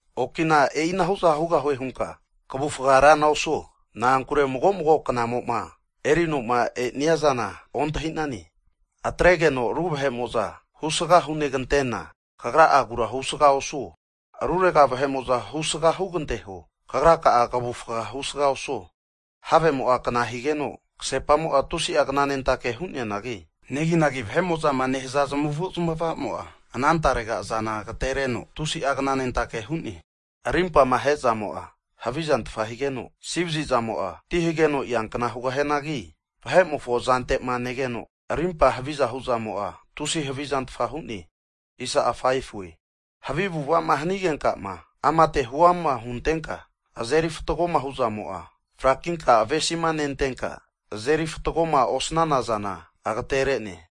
Okina e'inahu'za hugahue hunka kavufga rana osuo, na'ankure mago mago knamo'ma erino'ma e'nia zana ontahi'nane. Atregeno ru vahe'mo'za husga hunegantena, kagra'agura husga osuo. Rurega vahe'mo'za husga huganteho, kagra'a kavufga husga osuo. Havemo'a kna higeno, kasepamo'a tusi'a knanentake hu'neanagi, neginagi vahe'mo'zama nehaza zamavu'zmavamo'a, ana tarega zana agatereno tusi'a knanentake hu'ne. Rimpama ahe'zamo'a havizantfa higeno, asivazi zamo'a ti hageno eankna hugahianagi vahe'mofo zante'ma negeno arimpa haviza hu'zamo'a, tusia havizantfa hu'ne. Havi avu'ava'ma hanigenkama amate huama huntenka azeri fatgo'ma hu'zamo'a, frakinkama avesima nentenka azeri fatgoma osanana zana agatere'ne.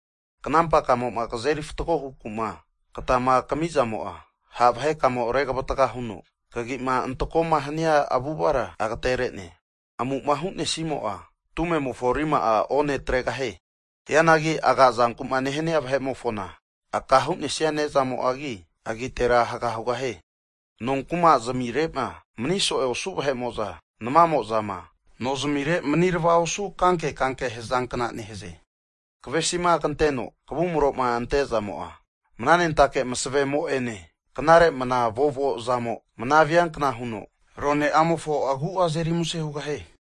Knampa kamo'ma kazeri fatgo hukuma katama kami'zamo'a, ha' vahekamo regavatga huno kagi'ma antako'ma hania avu'avara agatere'ne. Amu'ma hu'nesimo'a, tumemofo rima'a one atregahie. Hianagi agazanku'ma nehania vahe'mofona aka hu'nesia nezamo'agi, agitera haga hugahie. Nonkuma zamire'ma maniso'e osu vahe'mo'za, namamo'zama nozamire manirava osu kanke kankema hazankna nehaze. Kavesima kanteno kavumroma ante'zamo'a, mnanentake masavemo'ene knare mnavovo zamo mnaviankna huno rone'amofo agu'a azeri muse hugahie.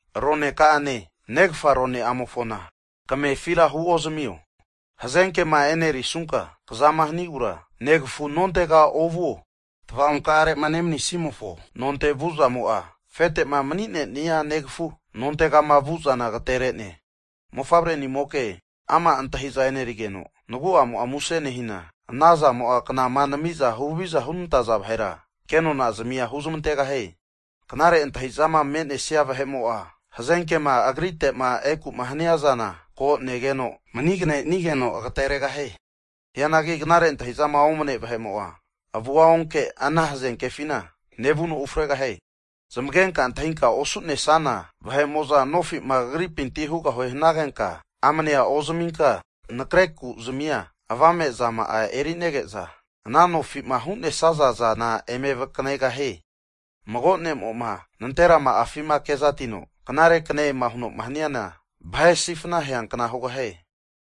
Roneka'ane negafa rone'amofona kamefira huozamio. Hazenkema e'nerisunka kazama hinogura negafu nontega ovuo. Tava'onkare'ma nemanisimofo nontega vu'zamo'a, afete'ma mani'nenia nagafu nontegama vu'zana ageterene. Mofavre'nimoka, ama' antahi'za e'nerigeno nagu'amo'a muse nehina, ana zamo'a knama nami'za huhaviza hunenantaza vahera kenona zamia huzamantegahie. Knare antahi'zama me'nesia vahe'mo'a hazenkema agrite'ma eku'ma haniazana ko negeno, maniganenigeno agateregahie. Hianagi knare antahi'zama omane vahe'mo'a, avua onkeno ana hazenkefina vuno ufregahie. Zamagenka antahinkama osu'nesana vahe'mo'za nofi'ma kagripinti hugahune hanagenka, amanea ozaminka nakre kuzmia avame zana erinege'za, ana nofi'ma hu'nesaza zana eme vakanegahie. Mago ne'mo'ma nanterama'afima kezatino, so'egane huno'ma haniana, vahe'ma sifna aheankna hugahie.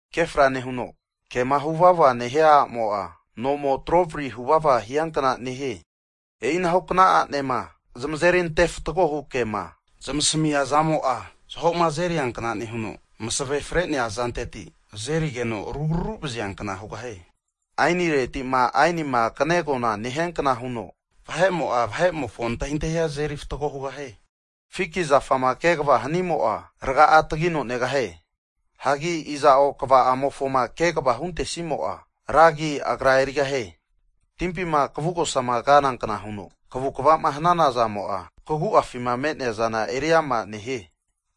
Ke fra nehuno kema huvavama nehia a'mo'a, nomo trovari huvava hiankna nehie. E'ina hu kna a'nema zamazeri ante fatgohu kema zamasamia zamo'a, zaho'ma azeriankna nehuno, masave fre'nea azanteti azerigeno arugraru vaziankna hugahie. Aenireti'ma, aenima kane'agonama nehiankna huno, vahe'mo'a, vahe'mofo antahintahia azeri fatgo hugahie. Fiki zafama kegava hanimo'a, raga'a tagino negahie. Hagi iza'o kva'amofoma kegava huntesimo'a, ra agi agra erigahie. Timpima kvugosama kanankna huno, kavukava'ma hanazamo'a kagu'afima me'neaza eri ama nehie.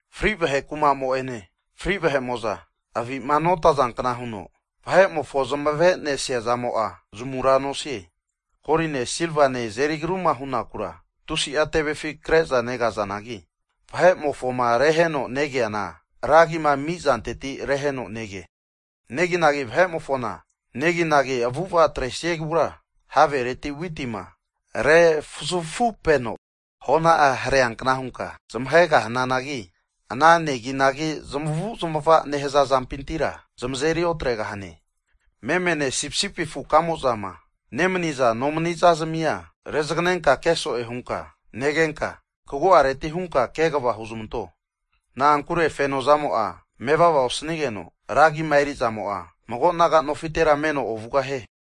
Fri vahe kuma'mo'ene, fri vahe'mo'za avi'ma notazankna huno, vahe'mofo zamavenesia zamo'a zamura nosie. Koline, silvama azeri agruma hunakura, tusi'a tevefi kre'za negazanagi, vahe'mofoma reheno negeana ragima amizanteti reheno nege. Neginagi vahe'mofona neginagi avu'ava atresiegura, havereti witima refuzafupeno hona'a hareankna hunka zmahegahananagi, ana neginagi zamavu'zamava'ma nehaza zampintira, zamazeri otregahane. Memene, sipisipi afukamo'zama nemaniza nomaniza zamia rezaganenka ke so'e hunka negenka, kagu'areti hunka kegava huzamanto. Na'ankure, fenozamo'a mevava osanigeno, ragima eri'zamo'a mago naga nofitera meno ovugahie.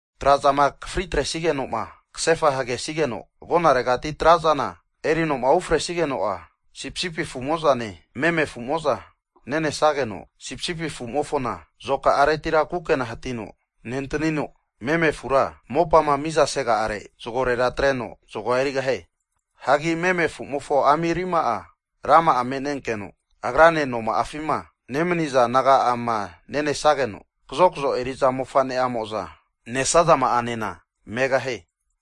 Trazama akafri atresigeno'ma kasefa hagesigeno agonaregati trazana erinoma ufresigeno'a, sipisipi afu'mo'zane meme afu'mo'za nenesageno, sipisipi afumofona azoka'aretira kukena hatino nentanino, meme afura mopama mizasega'are zagorera atreno zagoa erigahie. Hagi meme afumofo ami rima'a, rama'a me'nenkeno agrane noma'afima nemaniza naga'amo'zane nenesageno, kazokzo eri'za mofane'amo'za nesazama'anena megahie.